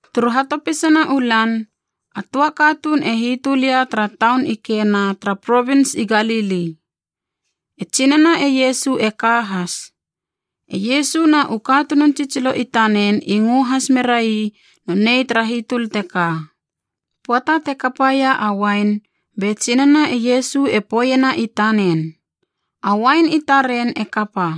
Turu hatopisana u lan, a töa katuun e hitöl ia tara taun i Kena tara provins i Galili, e tsinana e Iesu e ka has. E Iesu na u katunun tsitsilo i tanen i ngö has merai nonei tara hitöl teka. Pöata te kapaia a uain, be tsinana e Iesu e poeiena i tanen, “A uain i taren e kapa.”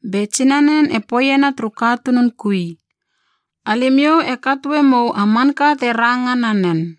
Be tsinanen e poeiena turu katunun kui, “Alimiou e katoe mou a manka te ranga nanen.”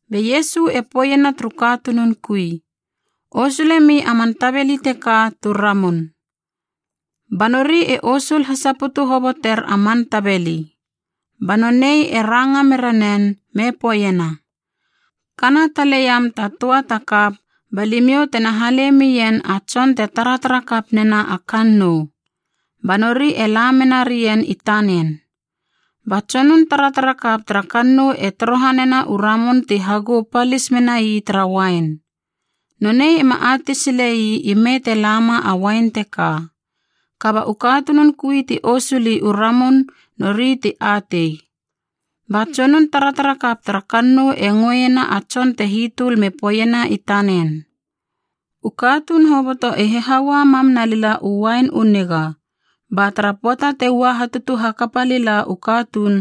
Be Iesu e poeiena turu katunun kui, “Osulemi a man tabeli teka tu ramun.” Ba nori e osul hasaputu hoboter a man tabeli. Ba nonei e ranga mera nen me poeiena, “Kana tale iam ta töa ta kap ba limiou tena hale mien a tson te taratara kap nena a kannou.” Ba nori e la mena rien i tanen. Ba tsonun taratarakap tara kannou e torohanena u ramun ti hagou palis menai tara uain. Nonei ema atei silei ime te lama a uain teka. Kaba u katunun kui ti osuli u ramun nori ti atei. Ba tsonun taratarakap tara kannou e ngöena a tson te hitöl me poeiena i tanen, “U katuun hoboto e hihaua mam nalila u uain u niga, ba tara pöata te ua hatutu hakapa lila u katuun,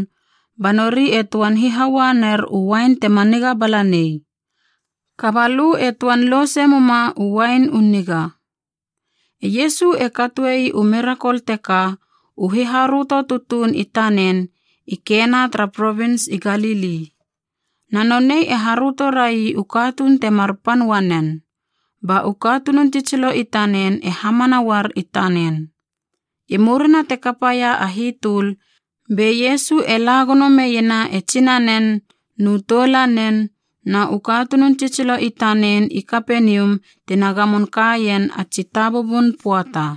ba nori e töan hihaua ner u uain tema niga bala nei. Kaba lö e töan louse muma u uain u niga.” E Iesu e katoei u mirakol teka, u hiharöto tutuun i tanen, i Kena tara provins i Galili. Na nonei e haröto rai u katuun temar pan uanen, ba u katunun tsitsilo i tanen e hamana uar i tanen. I murina te kapaia a hitöl, be Iesu e la gono meiena e tsinanen, nu toulanen na u katunun tsitsilo i tanen i Kapenium tina gamon kaien a tsi tabubun pöata.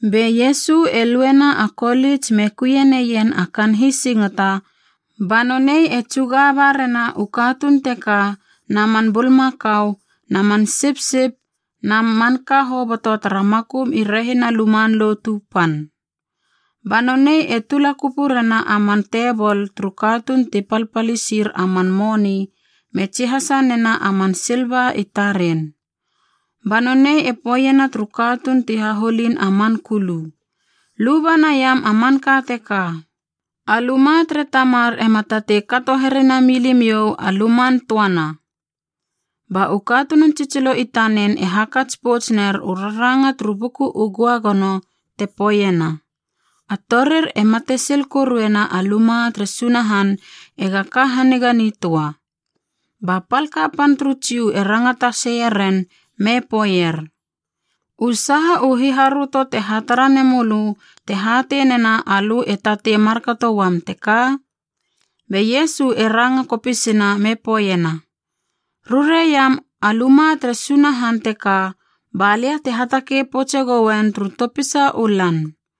Be Iesu e luena a kolits me kuie neien a kaan hisingata, ba nonei e tsuga ba rena u katuun teka na man bulmakau na man sipsip na manka hoboto tara makum i rehina Luman Lotu Pan. Ba nonei e tula kupu rena a man tebol turu katuun ti palpalisir a man moni me tsihasa nena a man silva i taren. Ba nonei e poeiena turu katuun ti haholin a man kulu, “Luba naiam a manka teka! A luma tere Tamar ema tatei kato here nami limiou a luman töana!” Ba u katunun tsitsilo i tanen e hakats pouts ner u raranga turu Buku u Göagono te poeiena, “A torir e matesil koruena a luma tere Sunahan ega ka haniga nitöa.” Ba pal kapan turu Jiu e rangata seieren me poeier, “U saha u hiharöto te hatara nemölö te hatei nena alö e tatei markato uam teka?” Be Iesu e ranga kopisina me poeiena, “Rurei iam a luma tere Sunahan teka balia te hatakei poutse goen turu topisa u lan.”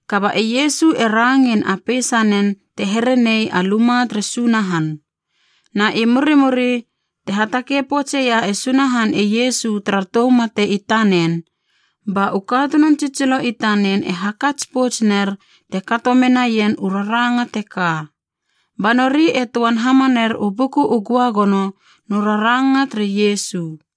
Kaba e Iesu e rangein a peisanen te here nei a luma tere Sunahan. Na i murimuri, te hatakei poutsia e Sunahan e Iesu tara tou mate i tanen, ba u katunun tsitsilo i tanen e hakats pouts ner te kato menaien u raranga teka. Ba nori e töan hamaner u Buku u Göagono nu raranga tere Iesu.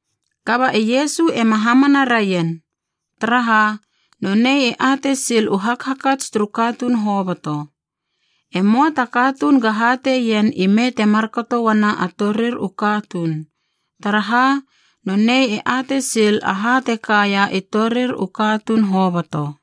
Kaba e Iesu ema hamana raien, taraha nonei e atei sil u hakhakats turu katuun hoboto. E möa ta katuun ga hatei ien ime te markato uana a torir u katuun. Taraha, nonei e atei sil aha te kaia i torir u katuun hoboto.